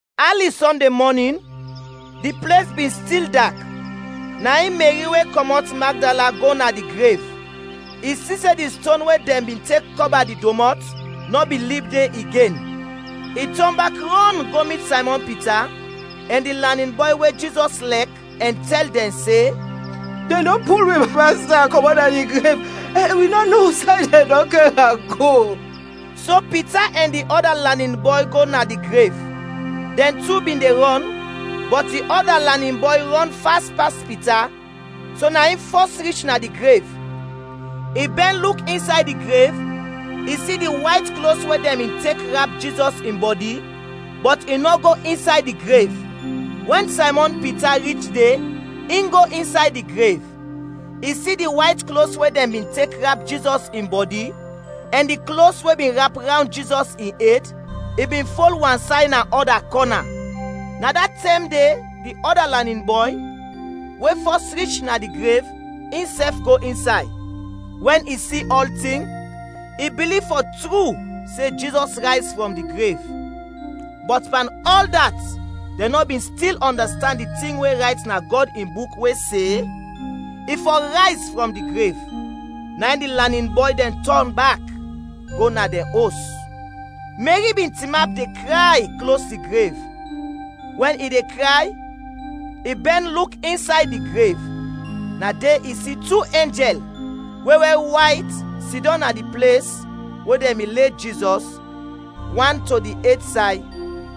Ali Sɔnde mɔnin, di ples bin stil dak, na in Meri we kɔmɔt Magdala go na di grev. I si se di ston we dɛn bin tek kɔba di domɔt nɔ bin lib de igen. I tɔn bak rɔn go mit Saymɔn Pita ɛn di lanin bɔy we Jizɔs lɛk ɛn tɛl dɛn se, “Dɛn dɔn pul wi Masta kɔmɔt na di grev ɛn wi nɔ no usay dɛn dɔn kɛr am go!” So Pita ɛn di ɔda lanin bɔy go na di grev. Dɛn tu bin de rɔn, bɔt di ɔda lanin bɔy rɔn fas pas Pita, so na in fɔs rich na di grev. I bɛn luk insay di grev, i si di wayt klos we dɛn bin tek rap Jizɔs in bɔdi, bɔt i nɔ go insay di grev. Wɛn Saymɔn Pita rich de, in go insay di grev. I si di wayt klos we dɛn bin tek rap Jizɔs in bɔdi, ɛn di klos we bin rap rawnd Jizɔs in ed, i bin fol wansay na ɔda kɔna. Na da tɛm de di ɔda lanin bɔy, we fɔs rich na di grev, insɛf go insay. Wɛn i si ɔltin, i biliv fɔ tru se Jizɔs rayz frɔm di grev. (Bɔt pan ɔl dat dɛn nɔ bin stil ɔndastand di tin we rayt na Gɔd in Buk we se, i fɔ rayz frɔm di grev.) Na in di lanin bɔy dɛn tɔn bak go na dɛn os. Meri bin tinap de kray klos di grev; wɛn i de kray, i bɛn luk insay di grev. Na de i si tu enjɛl we wɛr wayt sidɔm na di ples we dɛn bin le Jizɔs, wan to di ed say,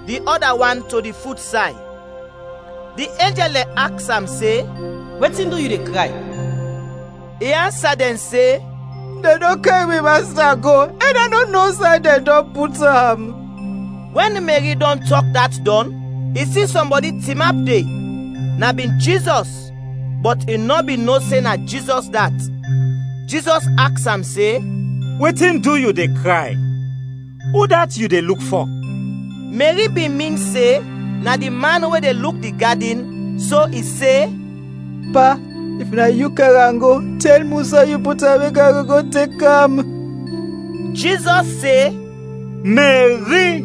di ɔda wan to di fut say. Di enjɛl dɛn aks am se, “Wetin du yu de kray?” I ansa dɛn se, “Dɛn dɔn kɛr mi Masta go, ɛn a nɔ no usay dɛn dɔn go put am.” Wɛn Meri dɔn tɔk dat dɔn, i si sɔmbɔdi tinap de, na bin Jizɔs, bɔt i nɔ bin no se na Jizɔs dat. Jizɔs aks am se, “Wetin du yu de kray? Udat yu de luk fɔ?” Meri bin min se na di man we de luk di gadin, so i se, “Pa, if na yu kɛr am go, tɛl mi usay yu put am, mek a go go tek am.” Jizɔs se, “Meri.”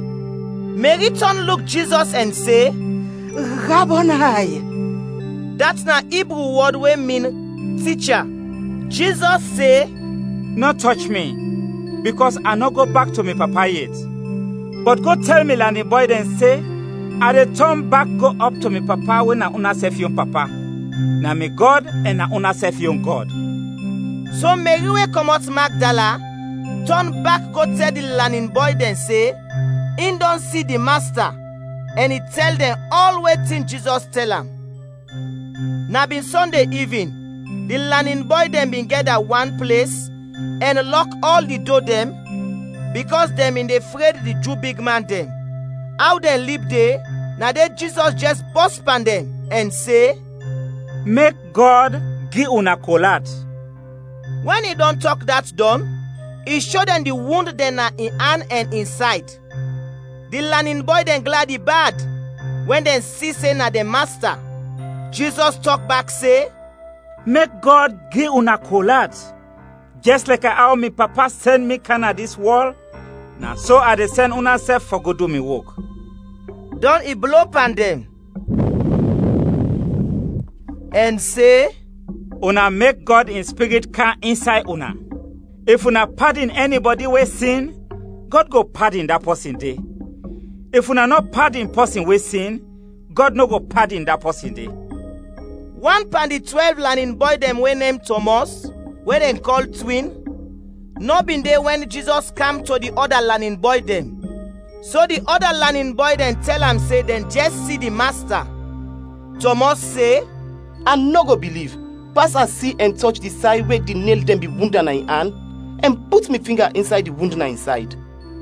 Meri tɔn luk Jizɔs ɛn se “Rabonay.” (Dat na Ibru wɔd we min “Ticha”.) Jizɔs se, “Nɔ tɔch mi, bikɔs a nɔ go bak to mi Papa yet. Bɔt go tɛl mi lanin bɔy dɛn se, a de tɔn bak go ɔp to mi Papa we na unasɛf yon Papa. Na mi Gɔd ɛn na unasɛf yon Gɔd.” So Meri we kɔmɔt Magdala tɔn bak go tɛl di lanin bɔy dɛn se in dɔn si di Masta, ɛn i tɛl dɛn ɔl wetin Jizɔs tɛl am. Na bin Sɔnde ivin, di lanin bɔy dɛn bin gɛda wan ples ɛn lɔk ɔl di do dɛn, bikɔs dɛn bin de fred di Ju bigman dɛn. Aw dɛn lib de, na de Jizɔs jɛs bɔs pan dɛn ɛn se, “Mek Gɔd gi una kol at.” Wɛn i dɔn tɔk dat dɔn, i sho dɛn di wund dɛn na in an ɛn in sayd. Di lanin bɔy dɛn gladi bad wɛn dɛn si se na dɛn Masta. Jizɔs tɔk bak se, “Mek Gɔd gi una kol at. Jɛs lɛkɛ aw mi Papa sɛn mi kam na dis wɔl, na so a de sɛn unasɛf fɔ go du mi wok.” Dɔn i blo pan dɛn ɛn se, “Una mek Gɔd in Spirit kam insay una. If una padin ɛnibɔdi we sin, Gɔd go padin da pɔsin de; if una nɔ padin pɔsin we sin, Gɔd nɔ go padin da pɔsin de.” Wan pan di twɛlv lanin bɔy dɛn we nem Tɔmɔs, we dɛn kɔl “Twin”, nɔ bin de wɛn Jizɔs kam to di ɔda lanin bɔy dɛn. So di ɔda lanin bɔy dɛn tɛl am se dɛn jɛs si di Masta. Tɔmɔs se, “A nɔ go biliv, pas a si ɛn tɔch di say we di nel dɛn bin wund am na in an, ɛn put mi finga insay di wund na in sayd.”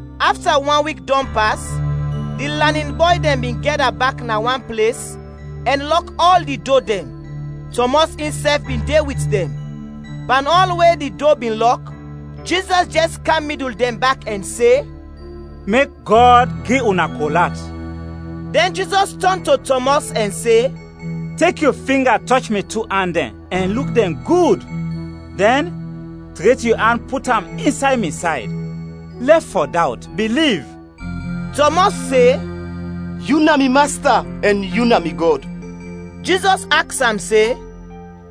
Afta wan wik dɔn pas, di lanin bɔy dɛn bin gɛda bak na wan ples, ɛn lɔk ɔl di do dɛn. Tɔmɔs insɛf bin de wit dɛn. Pan ɔl we di do bin lɔk, Jizɔs jɛs kam midul dɛn bak ɛn se, “Mek Gɔd gi una kol at.” Dɛn Jizɔs tɔn to Tɔmɔs ɛn se, “Tek yu finga tɔch mi tu an dɛn ɛn luk dɛn gud. Dɛn, tret yu an put am insay mi sayd. Lɛf fɔ dawt, biliv!” Tɔmɔs se, “Yu na mi Masta ɛn yu na mi Gɔd!” Jizɔs aks am se,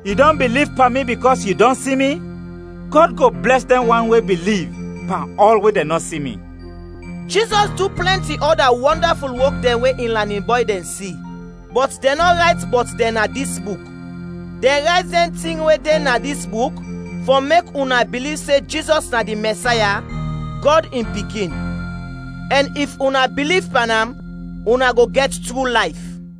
“Yu dɔn biliv pan mi bikɔs yu dɔn si mi? Gɔd go blɛs dɛn wan we biliv pan ɔl we dɛn nɔ si mi.” Jizɔs du plɛnti ɔda wɔndaful wok dɛn we in lanin bɔy dɛn si, bɔt dɛn nɔ rayt bɔt dɛn na dis buk. Dɛn rayt dɛn tin we de na dis buk fɔ mek una biliv se Jizɔs na di Mɛsaya, Gɔd in Pikin; ɛn if una biliv pan am, una go gɛt tru layf.